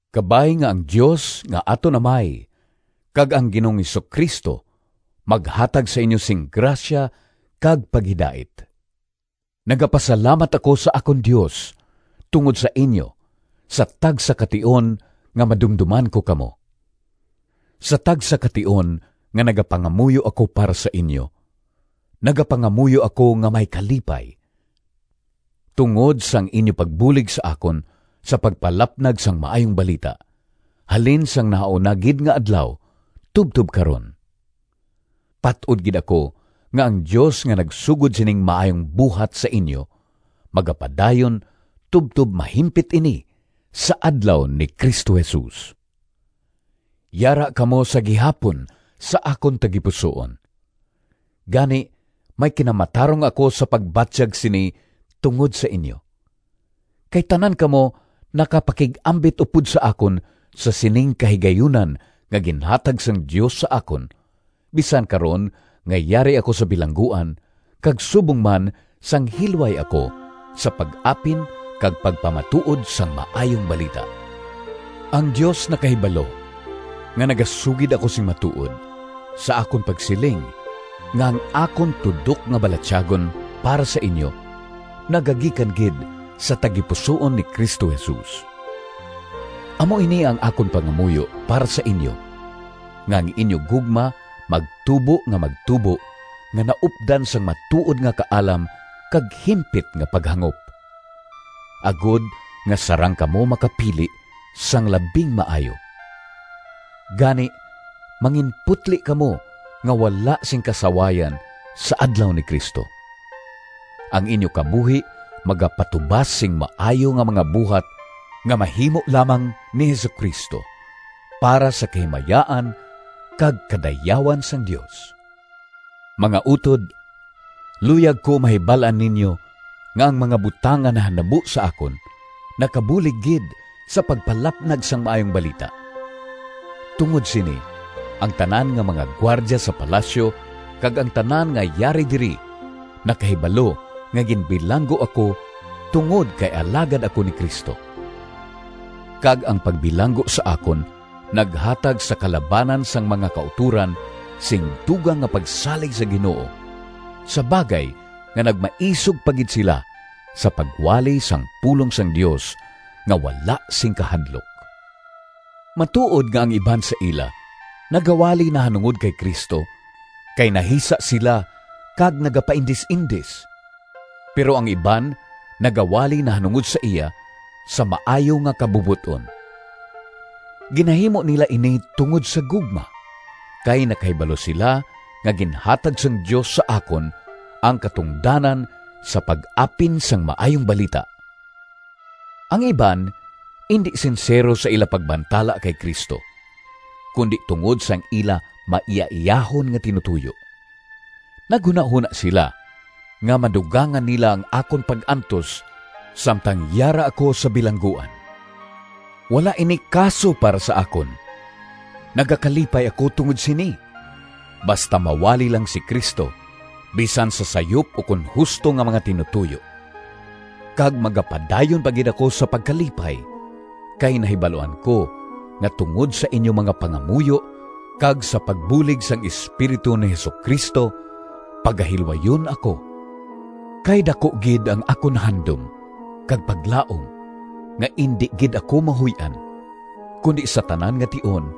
Kabay nga ang Dios nga aton Amay kag ang Ginoong Jesu-Cristo maghatag sa inyo sing grasya kag paghidait. Nagapasalamat ako sa akon Dios tungod sa inyo sa tagsa ka tion nga madumdoman ko kamo. Sa tagsa ka tion nga nagapangamuyo ako para sa inyo, nagapangamuyo ako nga may kalipay, tungod sang inyo pagbulig sa akon sa pagpalapnag sang Maayong Balita, halin sang nahauna gid nga adlaw tubtob karon. Pat-od gid ako nga ang Dios nga nagsugod sining maayong buhat sa inyo, magapadayon tubtob mahimpit ini sa Adlaw ni Cristo Jesus. Yara kamo sa gihapon sa akon tagipusoon! Gani may kinamatarong ako sa pagbatyag sini tungod sa inyo. Kay tanan kamo nakapakig-ambit upod sa akon sa sining kahigayunan nga ginhatag sang Dios sa akon, bisan karon nga yari ako sa bilangguan, kag subong man sang hilway ako sa pag-apin kag pagpamatuod sang Maayong Balita. Ang Dios nakahibalo nga nagasugid ako sing matuod, sa akon pagsiling nga ang akon tudok nga balatyagon para sa inyo nagagikan gid sa tagipusoon ni Cristo Jesus. Amo ini ang akon pangamuyo para sa inyo nga ang inyo gugma magtubo nga magtubo nga naupdan sang matuod nga kaalam kag himpit nga paghangop, agod nga sarang kamo makapili sang labing maayo. Gani manginputli kamo nga wala sing kasawayan sa Adlaw ni Cristo. Ang inyo kabuhi magapatubas sing maayo nga mga buhat nga mahimo lamang ni Jesu-Cristo, para sa kahimayaan kag kadayawan sang Dios. Mga utod, luyag ko mahibal-an ninyo nga ang mga butang nga nahanabo sa akon nakabulig gid sa pagpalapnag sang Maayong Balita. Tungod sini, ang tanan nga mga gwardya sa palasyo kag ang tanan nga yari diri nakahibalo nga ginbilanggo ako tungod kay alagad ako ni Cristo. Kag ang pagbilanggo sa akon naghatag sa kalabanan sang mga kautoran sing dugang nga pagsalig sa Ginoo, sa bagay nga nagmaisog pa gid sila sa pagwali sang pulong sang Dios nga wala sing kahadlok. Matuod nga ang iban sa ila nagawali nahanungod kay Cristo kay nahisa sila kag nagapaindis-indis, pero ang iban nagawali nahanungod sa iya sa maayo nga kabubot-on. Ginahimo nila ini tungod sa gugma, kay nakahibalo sila nga ginhatag sang Dios sa akon ang katungdanan sa pag-apin sang Maayong Balita. Ang iban indi sinsero sa ila pagbantala kay Cristo, kundi tungod sang ila maiyaiyahon nga tinutoyo. Naghunahona sila nga madugangan nila ang akon pag-antos samtang yara ako sa bilangguan. Wala ini kaso para sa akon! Nagakalipay ako tungod sini—basta mawali lang si Cristo, bisan sa sayop ukon husto nga mga tinutoyo. Kag magapadayon pa gid ako sa pagkalipay, kay nahibaluan ko nga tungod sa inyo mga pangamuyo kag sa pagbulig sang Espiritu ni Jesu-Cristo pagahilwayon ako. Kay daku gid ang akon handom kag paglaom nga indi gid ako mahuy-an, kundi sa tanan nga tion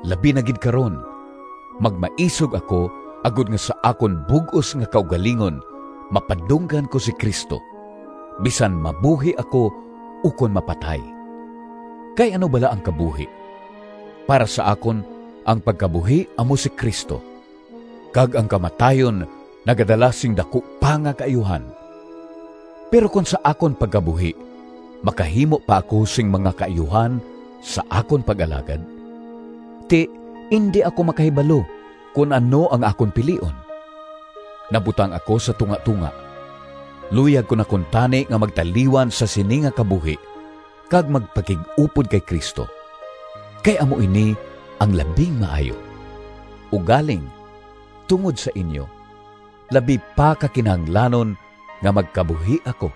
labi na gid karon, magmaisog ako, agod nga sa akon bug-os nga kaugalingon mapadunggan ko si Cristo, bisan mabuhi ako ukon mapatay. Kay ano bala ang kabuhi? Para sa akon ang pagkabuhi amo si Cristo, kag ang kamatayon nagadala sing daku pa nga kaayuhan. Pero kon sa akon pagkabuhi makahimo pa ako sing mga kaayuhan sa akon pag-alagad, ti indi ako makahibalo kon ano ang akon pilion. Nabutang ako sa tungatonga. Luyag ko na kuntani nga magtaliwan sa sini nga kabuhi kag magpakig-upod kay Cristo, kay amo ini ang labing maayo. Ugaling tungod sa inyo, labi pa ka kinahanglanon nga magkabuhi ako.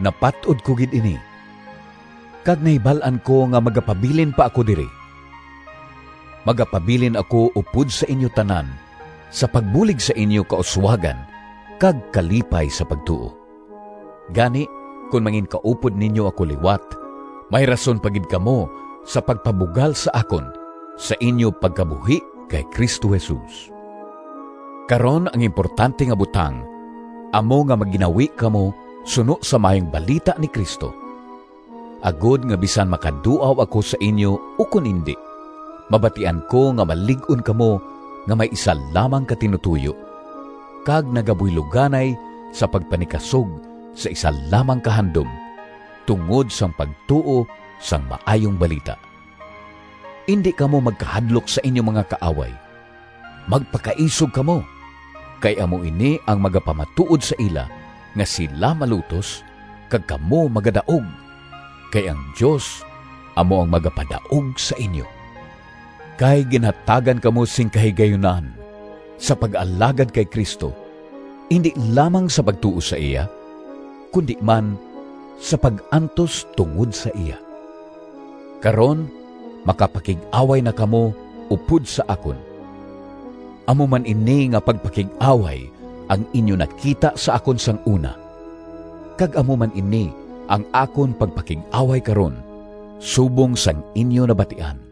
Napat-od ko gid ini kag nahibal-an ko nga magapabilin pa ako diri. Magapabilin ako upod sa inyo tanan sa pagbulig sa inyo kauswagan kag kalipay sa pagtuo. Gani kon manginkaupod ninyo ako liwat, may rason pa gid kamo sa pagpabugal sa akon, sa inyo pagkabuhi kay Cristo Jesus. Karon ang importante nga butang amo nga magginawi kamo suno sa Maayong Balita ni Cristo, agod nga bisan makaduaw ako sa inyo ukon indi, mabatian ko nga malig-on kamo nga may isa lamang ka tinutoyo kag nagabuyloganay sa pagpanikasog sa isa lamang ka handom tungod sang pagtuo sang Maayong Balita. Indi kamo magkahadlok sa inyo mga kaaway; magpakaisog kamo, kay amo ini ang magapamatuod sa ila nga sila malutos kag kamo magadaog, kay ang Dios amo ang magapadaog sa inyo! Kay ginhatagan kamo sing kahigayunan sa pag-alagad kay Cristo, indi lamang sa pagtuo sa iya, kundi man sa pag-antos tungod sa iya. Karon makapakig-away na kamo upod sa akon. Amo man ini nga pagpakig-away ang inyo nakita sa akon sang una, kag amo man ini ang akon pagpakig-away karon, subong sang inyo nabatian.